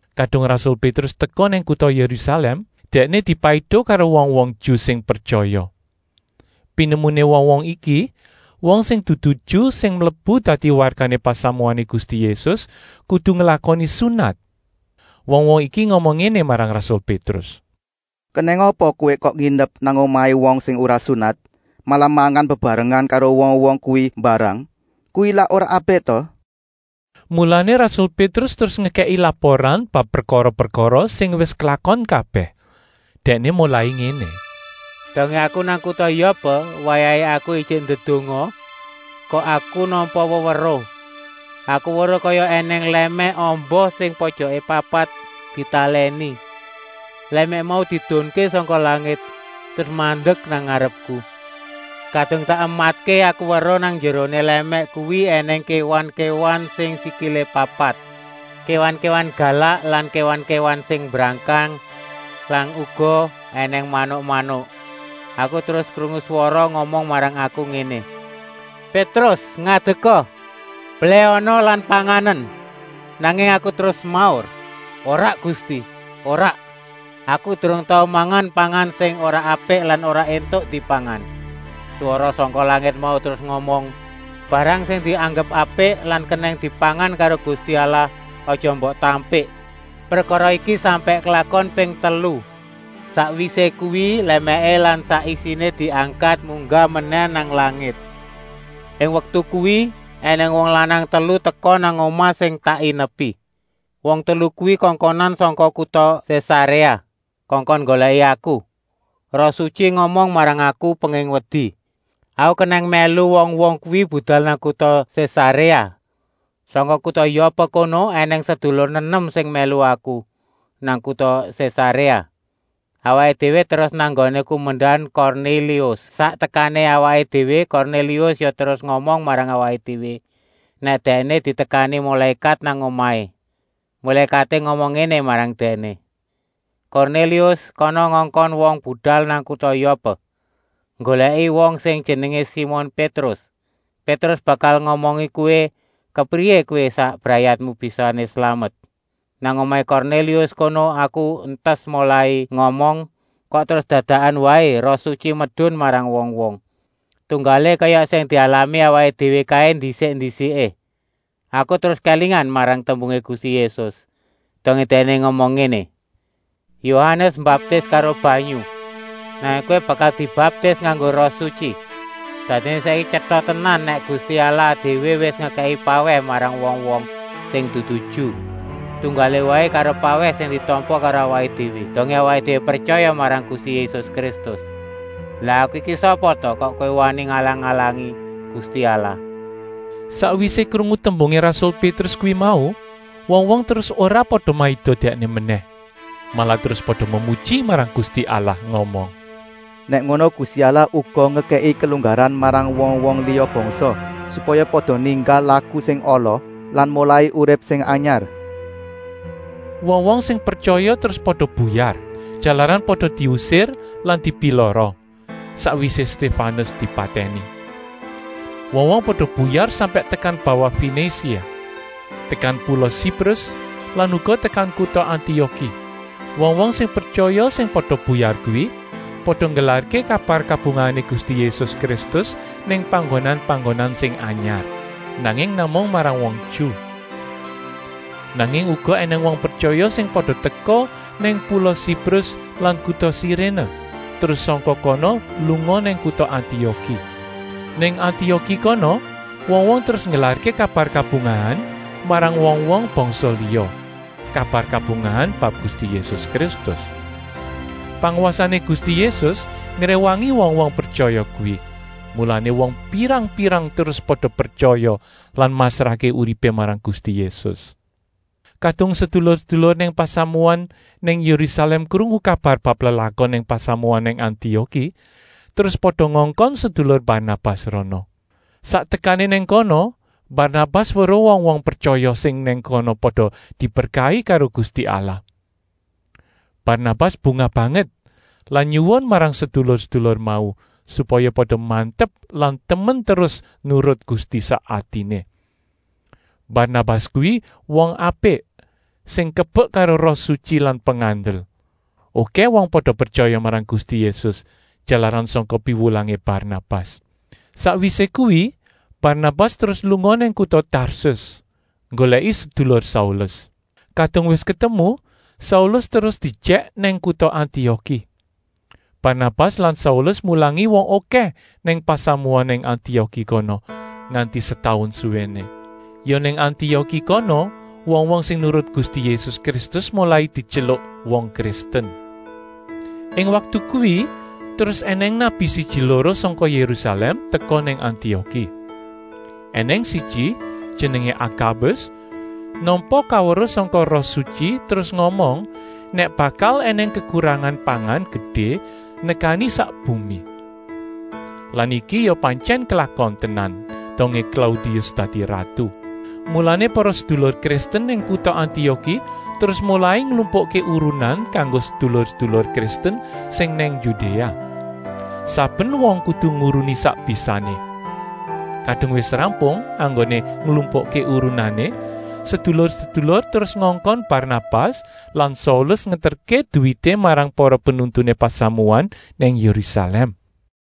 Kadung rasul Pétrus teka nang kuta Yérusalèm, dèkné dipaiduh karo wong-wong Ju sing pretyaya. Pinemuné wong-wong iki, wong sing dudu Ju sing mlebu dadi wargané pasamuané Gusti Yésus kudu nglakoni sunat. Wong-wong iki ngomong ngéné marang rasul Pétrus: “Kenèng apa kowé kok nginep nang omahé wong sing ora sunat, malah mangan bebarengan karo wong-wong kuwi mbarang? Kuwi lak ora apik ta?” Mulané rasul Pétrus terus ngekèki laporan bab prekara-prekara sing wis klakon kabèh. Dèkné molai ngéné: “Dongé aku nang kuta Yopé, wayahé aku ijik ndedonga, kok aku nampa weweruh. Aku weruh kaya ènèng lèmèk amba sing pojokané papat ditalèni. Lèmèk mau diedunké sangka langit terus mandek nang ngarepku. Kadung tak ematké aku weruh nang njeroné lèmèk kuwi ènèng kéwan-kéwan sing sikilé papat, kéwan-kéwan galak lan kéwan-kéwan sing mbrangkang lan uga ènèng manuk-manuk. Aku terus krungu swara ngomong marang aku ngéné: ‘Pétrus, ngadeka, belèhana lan panganen!’ Nanging aku terus semaur: ‘Ora Gusti, ora! Aku durung tau mangan pangan sing ora apik lan ora éntuk dipangan!’ Swara sangka langit mau terus ngomong: ‘Barang sing dianggep apik lan kenèng dipangan karo Gusti Allah aja mbok tampik!’ Prekara iki sampèk klakon ping telu. Sakwisé kuwi lèmèké lan sak isiné diangkat munggah menèh nang langit. Ing waktu kuwi ènèng wong lanang telu teka nang omah sing tak inepi. Wong telu kuwi kongkonan sangka kuta Sésaréa, kongkon nggolèki aku. Roh Sutyi ngomong marang aku penging wedi, aku kenèng mèlu wong-wong kuwi budal nang kuta Sésaréa. Sangka kuta Yopé kono ènèng sedulur nenem sing mèlu aku nang kuta Sésaréa. Awaké déwé terus nang nggoné kumendan Kornélius. Sak tekané awaké déwé Kornélius ya terus ngomong marang awaké déwé nèk dèkné ditekani mulékat nang omahé. Mulékaté ngomong ngéné marang dèkné: ‘Kornélius, kana ngongkon wong budal nang kuta Yopé nggolèki wong sing jenengé Simon Pétrus. Pétrus bakal ngomongi kowé kepriyé kowé sak brayatmu bisané slamet.’ Nang omahé Kornélius kono aku entas molai ngomong, kok terus dadakan waé Roh Sutyi medun marang wong-wong, tunggalé kaya sing dialami awaké déwé kaé ndisik-ndisiké. Aku terus kélingan marang tembungé Gusti Yésus, dongé Dèkné ngomong ngéné: ‘Yohanes mbaptis karo banyu, nanging kowé bakal dibaptis nganggo Roh Sutyi!’ Dadiné saiki tyeta tenan nèk Gusti Allah déwé wis ngekèki pawèh marang wong-wong sing dudu Ju, tunggalé waé karo pawèh sing ditampa karo awaké déwé, dongé awaké déwé pretyaya marang Gusti Yésus Kristus. Lah aku iki sapa ta, kok wani ngalang-alangi Gusti Allah?” Sakwisé krungu tembungé rasul Pétrus kuwi mau, wong-wong terus ora pada maido dèkné menèh, malah terus pada memuji marang Gusti Allah ngomong: “Nèk ngono Gusti Allah uga ngekèki kelunggaran marang wong-wong liya bangsa, supaya pada ninggal laku sing ala lan molai urip sing anyar.” Wong-wong sing pretyaya terus pada buyar, jalaran pada diusir lan dipilara, sakwisé Stéfanus dipatèni. Wong-wong pada buyar sampèk tekan bawah Fenisia, tekan pula Siprus lan uga tekan kuta Antioki. Wong-wong sing pretyaya sing pada buyar kuwi pada nggelarké kabar kabungahané Gusti Yésus Kristus nang panggonan-panggonan sing anyar, nanging namung marang wong Ju. Nanging uga ènèng wong pretyaya sing pada teka nang pula Siprus lan kuta Siréné, terus sangka kono lunga nang kuta Antioki. Nang Antioki kono wong-wong terus nggelarké kabar kabungahan marang wong-wong bangsa liya, kabar kabungahan bab Gusti Yésus Kristus. Pangwasané Gusti Yésus ngréwangi wong-wong pretyaya kuwi, mulané wong pirang-pirang terus pada pretyaya lan masrahké uripé marang Gusti Yésus. Kadung sedulur-sedulur nang pasamuan nang Yérusalèm krungu kabar bab lelakon nang pasamuan nang Antioki, terus pada ngongkon sedulur Barnabas rana. Sak tekané nang kono Barnabas weruh wong-wong pretyaya sing nang kono pada diberkahi karo Gusti Allah. Barnabas bungah banget lan nyuwun marang sedulur-sedulur mau, supaya pada mantep lan temen terus nurut Gusti sak atiné. Barnabas kuwi wong apik sing kebek karo Roh Sutyi lan pengandel. Okèh wong pada pretyaya marang Gusti Yésus, jalaran sangka piwulangé Barnabas. Sakwisé kuwi Barnabas terus lunga nang kuta Tarsus, nggolèki sedulur Saulus. Kadung wis ketemu, Saulus terus diejèk nang kuta Antioki. Barnabas lan Saulus mulangi wong okèh nang pasamuan nang Antioki kono, nganti setaun suwéné. Ya nang Antioki kono wong-wong sing nurut Gusti Yésus Kristus molai dityeluk wong Kristen. Ing waktu kuwi terus ènèng nabi siji-loro sangka Yérusalèm teka nang Antioki. Enèng siji, jenengé Akabus, nampa kaweruh sangka Roh Sutyi terus ngomong nèk bakal ènèng kekurangan pangan gedé nekani sak bumi. (Lan iki ya pantyèn klakon tenan dongé Klaudius dadi ratu.) Mulané para sedulur Kristen nang kuta Antioki terus molai nglumpukké urunan kanggo sedulur-sedulur Kristen sing nang Yudéa. Saben wong kudu nguruni sak bisané. Kadung wis rampung enggoné nglumpukké urunané, sedulur-sedulur terus ngongkon Barnabas lan Saulus ngeterké duwité marang para penuntuné pasamuan nang Yérusalèm.